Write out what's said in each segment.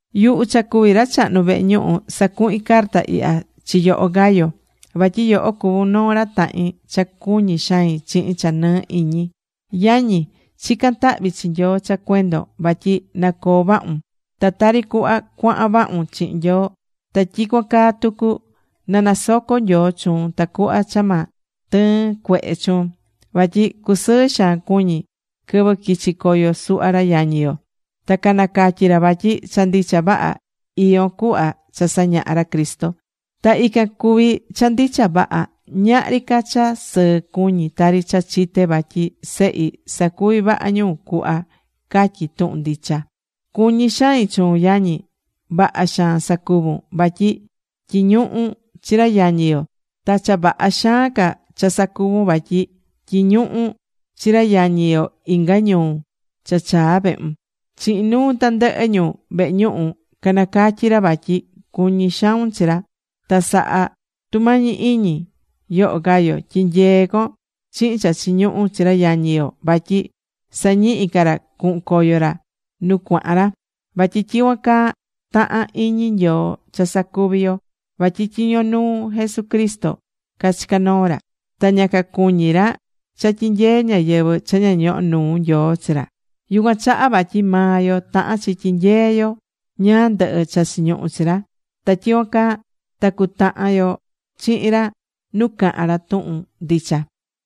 Yuhu cha cuví ra chahnu vehe ñuhu, sacuhín carta ihya chi yoho, Gayo, vatyi yoho cuvún noo ra tahin cha cuñí xain chihin cha nɨɨ iñi. Yañi, chicán tahvi chi Nyoo cha cuendon vatyi na coo vahun. Ta tari cuhva cuahan vahun chihin Nyoo, ta tyicuan caa tucu, na nasoco Nyoo chuun tacuhva cha ma tɨɨn cuehe chuun. Vatyi cusɨɨ xaan cuñi̱ quɨvɨ quichi̱ coyo suhva ra yañi yo. Ta canacatyi̱ ra vatyi cha ndicha vaha iyón cuhva cha sañaha̱ ra Cristo. Ta ican cuví cha ndicha vaha. Ñahri ca cha sɨɨ cuñí tari cha chité vatyi sehi sacuví vaha ñu cuhva catyí tuhun ndicha. Cuñí xain chuun, yañi. Vaha xaan sacuvún, vatyi tyiñuhún chi ra yañi yo, ta cha vaha xaan ca cha sacuvún vatyi tyiñuhún chi ra yañi yo inga ñuu cha chaa vehun. Chihin nuu tandɨhɨ ñu vehe ñuhu canacatyí ra vatyi cuñí xaun chi ra. Ta sa̱ha tumañi iñi, yoho Gayo, tyi̱nyee con chihin cha chiñuhú chi ra yañi yo vatyi sañihi ca ra cuhun coyo ra nu cuahan ra. Vatyi tyicuan caa tahán iñi Nyoo cha sacuvi yo. Vatyi tyiño nuu Jesucristo cachicá noo ra. Ta ña cacuñí ra cha tyinyee ñáyɨvɨ cha ña ñohó nuu Nyoo chi ra. Yucuan chaha vatyi maa yo tahán chi nyehe yo ñáá ndɨhɨ cha chiñuhú chi ra. Ta tyicuan caa ta cutahan yo chihin ra nu cahán ra tuhun ndicha.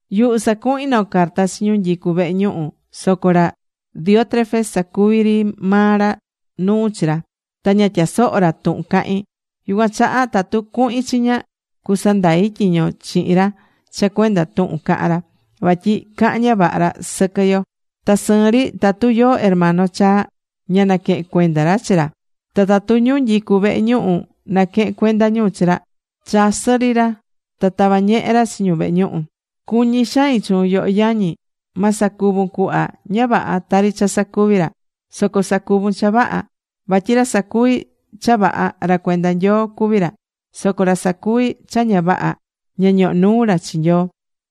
Yuhu sacuhi̱n noo carta chi ñu nyicú vehe ñuhu, soco ra Diótrefes sacuví ri maa ra nuu chi ra, ta ña tyasohó ra tuhun cahín. Yucuan chaha tatu cuhin chiña, cusandai tyiño chihin ra cha cuenda tuhun cahán ra, vatyi cahán ña vaha ra sɨquɨ yo. Ta sɨɨn ri tatu yóó hermano chaa, ña naquehén cuenda ra chi ra. Ta tatu ñu nyicú vehe ñuhu naquehén cuenda ñu chi ra, chasɨ́ ri ra, ta tavá ñehe ra chi ñu vehe ñuhu. Cuñí xain chuun, yoho yañi. Ma sacuvun cuhva ña vaha tari cha sacuví ra, soco sa̱cuvun cha vaha. Vatyi ra sacuví cha vaha, ra cuenda Nyoo cuví ra, soco ra sacuví cha ña vaha, ña ñohó nuu ra chi Nyoo.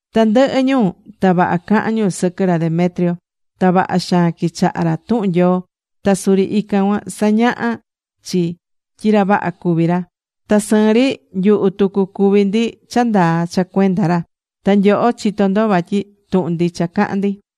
Tandɨhɨ ñu ta vaha cahán ñu sɨquɨ ra Demetrio. Ta vaha xaan quichahá ra tuhun Nyoo, ta suri ican cuan sañahá chi tyi ra vaha cuví ra. Ta sɨɨn ri nyuhu tucu cuví ndi cha ndaa cha cuenda ra, ta nyoho chitó ndo vatyi tuhun ndicha cahán ndi.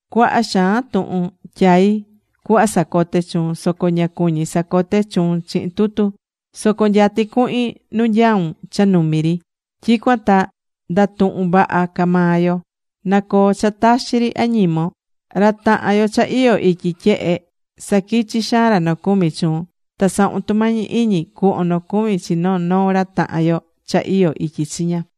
Cuaha xaan tuhun tyaí cuhva sacote chuun, soco ña cuñí sacote chuun chihin tutu. Soco nyatí cuhin nu nyaún cha numi ri, tyicuan ta ndatuhun vaha ca maa yo. Na coo cha taxi ri añimon. Ra tahan yo cha iyó ityi tyehe saquichí xaan ra nocumi chuun. Ta sa̱hun tumañi iñi cu̱hvon nocumi chi noo noo ra tahan yo cha iyó ityi chiña.